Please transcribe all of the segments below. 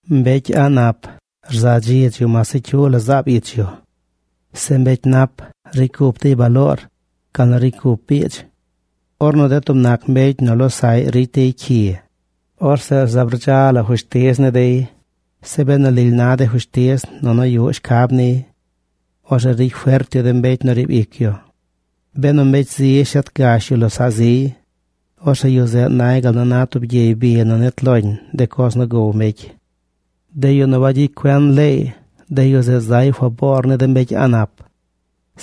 Mbecy a̱ꞌ nap rza dziidz yu mas se cyu la zaab ich yu. Se mbecy nap ricy cup dey baloor gal nu ricy cup biidz. Ornu de tub nac mbecy nu losaꞌy ricy dey cyi, orzeꞌ zaab rdza la fushtiz ni dey. Zeꞌ benu lily na de fushtiz nunu yuꞌ shcab niy, orzeꞌ ricy fert yu de mbecy nu riib ic yu. Benu mbecy zi shet gash yu losaꞌ ziy, orzeꞌ yu zeꞌ nay gal nu na tub gyey bi nu nit loñ de coz nu gow mbecy. De yu nu wagyicy cuen leey, de yu zeꞌ zay faboor ni de mbecy a̱ꞌ nap.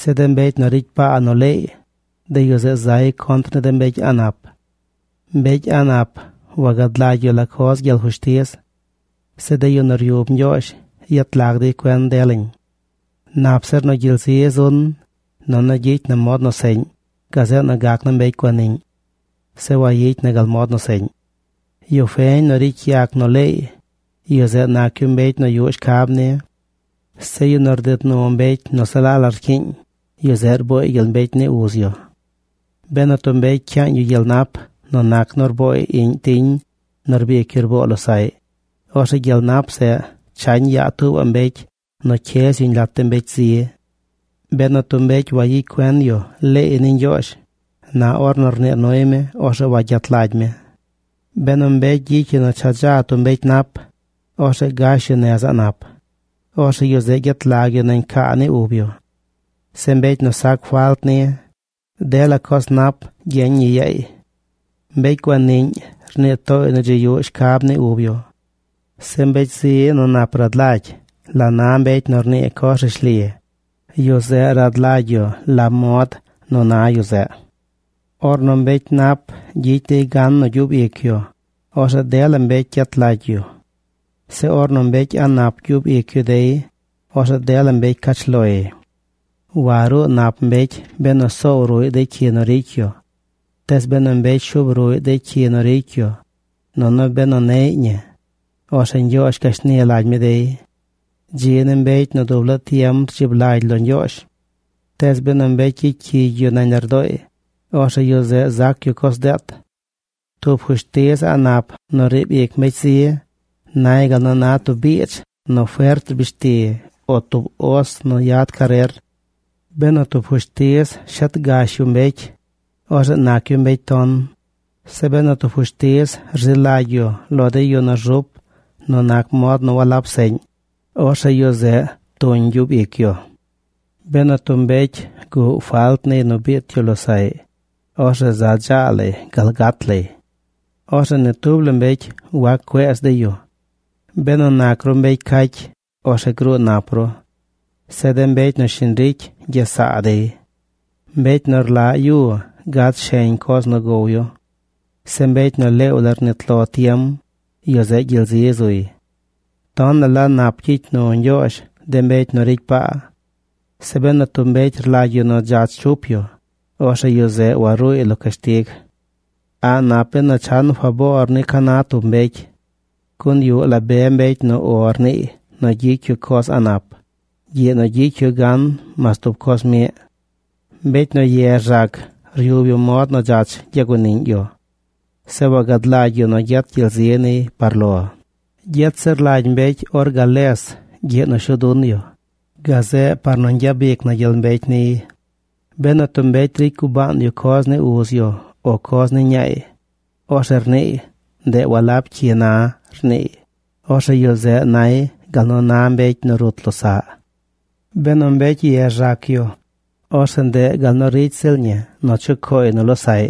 Zeꞌ de mbecy nu ricy paa nu leey, de yu zeꞌ zay contr ni de mbecy a̱ꞌ nap. Mbecy a̱ꞌ nap wagad lagy yu la coz gyel fushtiz. Zeꞌ de yu nu ryub Ñgyoozh yet lag dey cuen delañ. Nap zir nu gyel zi zun nunu gyicy na mod nu seꞌñ gazeꞌ nu gac naa mbecy guaniꞌñ. Zeꞌ wayicy na gal mod nu seꞌñ. Yu feñ nu ricy yac nu leey, yu zeꞌ nac yu mbecy nu yuꞌ shcab ni. Zeꞌ yu nu rded nu mbecy nu se la la rcyiiñ, yu zeꞌ rbooy gyel mbecy ni uz yu. Benu tub mbecy cyaañ yu gyel nap nu nac nu rbooy iꞌñ tiñ nu rbic yu rboo losaꞌy, orzeꞌ gyel nap zeꞌ chañ yaa tuubaꞌ mbecy nu cyez yuñ lat de mbecy zi. Benu tub mbecy wagyicy cuen yu leey ni Ñgyoozh, na ornu rnii nuy mi, orzeꞌ wagyet lagy mi. Benu mbecy gyicy yu nu cha dza tub mbecy nap, orzeꞌ gash yu nez a̱ꞌ nap, orzeꞌ yu zeꞌ gyet lag yu nañ caa ni ub yu. Zeꞌ mbecy nu sac falt ni, dela coz nap gyeñ ñi yaay. Mbecy guaniꞌñ rnii tooy nu dzi yuꞌ shcab ni ub yu. Zeꞌ mbecy zi nu nap rad lagy la na mbecy nu rnii coz rishli, yu zeꞌ rad lagy yu la mod nu na yu zeꞌ. Ornu mbecy nap gyicy dey gan nu gyub ic yu, orzeꞌ dela mbecy gyet lagy yu. Zeꞌ ornu mbecy a̱ꞌ nap gyub ic yu dey, orzeꞌ dela mbecy cach loy. Waruu nap mbecy benu soow ruꞌy de cyi nu ricy yu. Tees benu mbecy shuub ruꞌy de cyi nu ricy yu, nunu benu neꞌy ñi, orzeꞌ Ñgyoozh gashni lagy mi dey. Dzi ni mbecy nu dub laa tiem rdzib lagy lo Ñgyoozh. Tees benu mbecy gyicy cyigy yu nañ lardooy, orzeꞌ yu zeꞌ zac yu coz deet. Tub fushtiz a̱ꞌ nap nu riib ic mbecy zi nay gal nu na tub biidz nu fert rbishti o tub os nu yad carer. Benu tub fushtiz shet gash yu mbecy, orzeꞌ nac yu mbecy ton. Zeꞌ benu tub fushtiz rzi lagy yu lo de yu nu rzup nu nac mod nu walab seꞌñ, orzeꞌ yu zeꞌ tuñ gyub ic yu. Benu tub mbecy guꞌ falt niy nu biit yu losaꞌy, orzeꞌ za dzaa lay gal gat lay. Orzeꞌ ni tub la mbecy wac cueez dey yu. Benu nac ru mbecy cacy, orzeꞌ gruu nap ru. Zeꞌ de mbecy nu shiñ ricy gyes saa dey. Mbecy nu rlaꞌ yu gad sheñ coz nu gow yu. Zeꞌ mbecy nu leew la rnit lo tiem, yu zeꞌ gyel zi zuy. Tonaꞌ la nap gyicy nu Ñgyoozh de mbecy nu ricy paa. Zeꞌ benu tub mbecy rlagy yu nu dzach chup yu, orzeꞌ yu zeꞌ waruuy lo cashtig. A̱ꞌ nap benu chan faboor ni ca na tub mbecy. Gun yuꞌ la be mbecy nu “O” rniiy nu gyicy yu coz a̱ꞌ nap gyiꞌ nu gyicy yu gan mas tub coz miꞌ. Mbecy nu ye rzac ryub yu mod nu dzach gyaguaniꞌñ yu. Zeꞌ wagad lagy yu nu gyet gyel zi niy par lo. Gyet zir lagy mbecy or gales gyiꞌ nu shuu dun yu, gazeꞌ par nu ñgyabic na gyel mbecy niy. Benu tub mbecy ricy gubaan yu coz ni uz yu o coz ni ñaay, orzeꞌ rniiy: “Ndeꞌ walab cyi na rniiy”, orzeꞌ yu zeꞌ nay gal nu na mbecy nu rut losaꞌ. Benu mbecy ye rzac yu, orzeꞌ ndeꞌ gaal nu ricy ziꞌl ñi nu chucooy nu losaꞌy.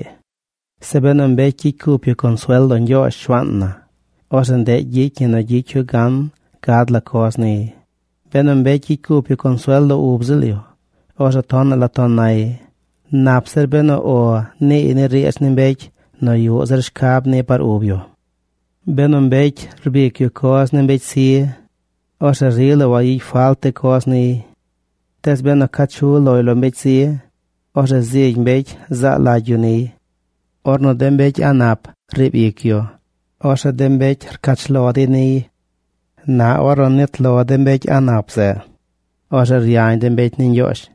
Zeꞌ benu mbecy gyicy cup yu consuel lo Ñgyoozh, Shuaan na, orzeꞌ ndeꞌ gyicy ñi nu gyicy yu gan gad la coz niy. Benu mbecy gyicy cup yu consuel lo ub ziꞌl yu, orzeꞌ tonaꞌ la ton nay. Nap zir benu “O”, niiy ni riidz ni mbecy nu yuꞌ zir shcab ni par ub yu. Benu mbecy rbic yu coz ni mbecy zi, orzeꞌ rila wayicy falt de coz niy. Tees benu ca chu loy lo mbecy zi, orzeꞌ zigy mbecy zaa lagy yu niy. Ornu de mbecy a̱ꞌ nap riib ic yu, orzeꞌ de mbecy cach lo dey loy. Na ornu nit lo de mbecy a̱ꞌ nap zeꞌ, orzeꞌ ryañ de mbecy ni Ñgyoozh.